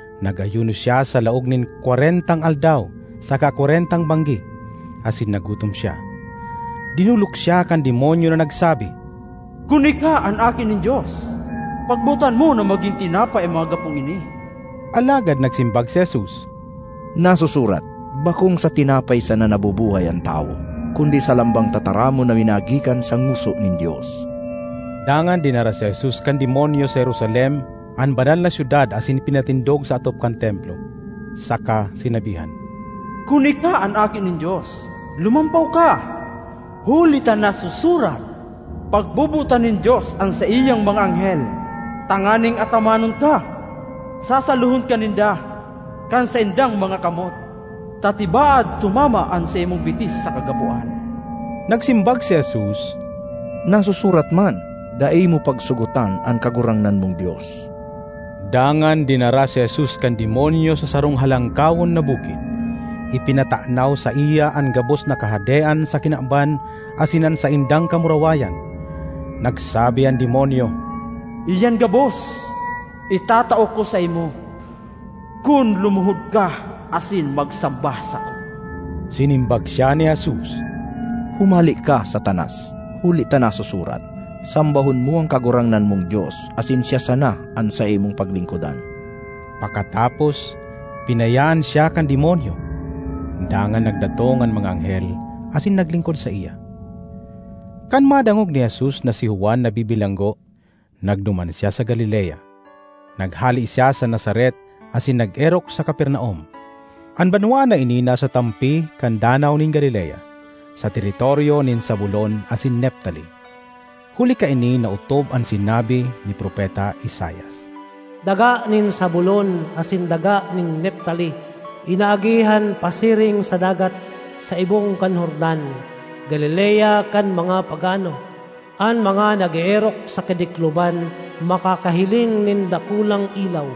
Nag-ayuno siya sa laog nin kwarentang aldaw saka kwarentang banggi, asin nagutom siya. Dinolok siya kan Demonyo na nagsabi, “Kun ika an Aki nin Dios, pagbotan mo na magin tinapay an mga gapong ini.” Alagad nagsimbag si Jesus, “Nasusurat, ‘Bakong sa tinapay sana nabubuhay an tawo, kundi sa lambang tataramon na minagikan sa ngoso nin Dios.’” Dangan dinara si Jesus kan Demonyo sa Jerusalem an Banal na Syudad asin pinatindog sa atop kan Templo, saka sinabihan, “Kun ika an Aki nin Dios, lumampaw ka, huli ta nasusurat, ‘Pagbobotan nin Dios an saiyang mga anghel tanganing atamanon ka; sasalohon ka ninda kan saindang mga kamot, ta tibaad tumama an saimong bitis sa kagapoan.’” Nagsimbag si Jesus, “Nasusurat man, ‘Dai mo pagsugotan an Kagurangnan mong Dios.’” Dangan dinara si Jesus kan Demonyo sa sarong halangkawon na bukid. Ipinatanaw saiya an gabos na kahadean sa kinaban asin an saindang kamurawayan. Nagsabi an Demonyo, “Iyan gabos itatao ko saimo, kun lumuhod ka asin magsamba sako.” Sinimbag siya ni Jesus, “Humale ka, Satanas! Huli ta nasusurat, ‘Sambahon mo an Kagurangnan mong Dios, asin siya sana an saimong paglingkodan.’” Pakatapos, binayaan siya kan Demonyo; dangan nagdatong an mga anghel asin naglingkod saiya. Kan madangog ni Jesus na si Juan nabibilanggo, nagduman siya sa Galilea. Naghale siya sa Nazaret asin nag-erok sa Capernaum. An banwaan na ini nasa tampi kan Danaw nin Galilea, sa teritoryo nin Zabulon asin Neftali. Huli kaini naotob an sinabi ni Propeta Isaias: ”Daga nin Zabulon asin daga nin Neftali, inaagihan pasiring sa dagat, sa ibong kan Jordan, Galilea kan mga pagano! An mga nag-eerok sa kadikloman makakahiling nin dakulang ilaw!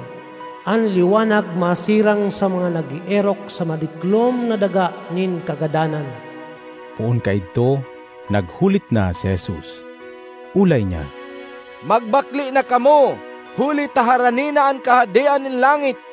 An liwanag masirang sa mga nag-eerok sa madiklom na daga nin kagadanan!” Poon kaidto naghulit na si Jesus. Olay niya, “Magbakle na kamo huli ta harani na an Kahadean nin langit!”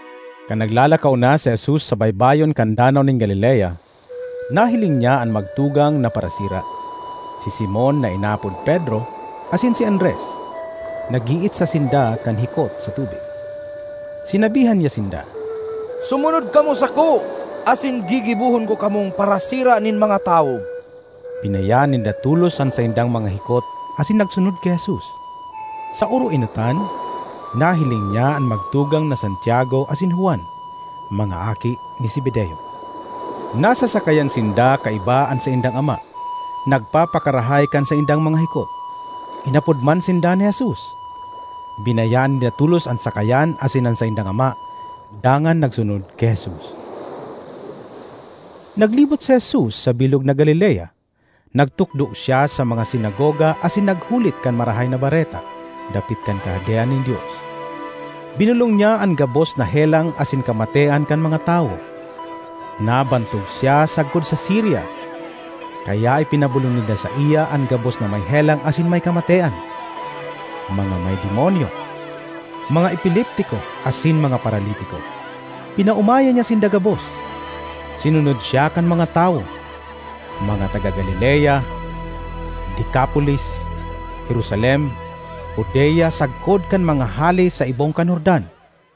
Kan naglalakaw si Jesus sa baybayon kan Danaw nin Galilea, nahiling niya an magtugang na parasira, si Simon na inaapod Pedro asin si Andres. Nag-iitsa sinda kan hikot sa tubig. Sinabihan niya sinda, “Sumunod kamo sako, asin gigibohon ko kamong parasira nin mga tawo.” Binayaan ninda tolos an saindang mga hikot asin nagsunod ki Jesus. Sa oroenotan, nahiling niya an magtugang na Santiago asin Juan, mga aki ni Zebedeo. Nasa sakayan sinda kaiba an saindang ama, nagpapakarahay kan saindang mga hikot. Inapod man sinda ni Jesus. Binayaan ninda tolos an sakayan asin an saindang ama, dangan nagsunod ki Jesus. Naglibot si Jesus sa bilog na Galilea. Nagtukdo siya sa mga sinagoga asin naghulit kan Marahay na Bareta dapit kan Kahadean nin Dios. Binolong niya an gabos na helang asin kamatean kan mga tawo. Nabantog siya sagkod sa Siria, kaya ipinabolong ninda saiya an gabos na may helang asin may kamatean: mga may demonyo, mga epileptiko asin mga paralitiko. Pinaomayan niya sinda gabos. Sinunod siya kan mga tawo: mga taga Galilea, Decapolis, Jerusalem, Judea sagkod kan mga hale sa ibong kan Jordan.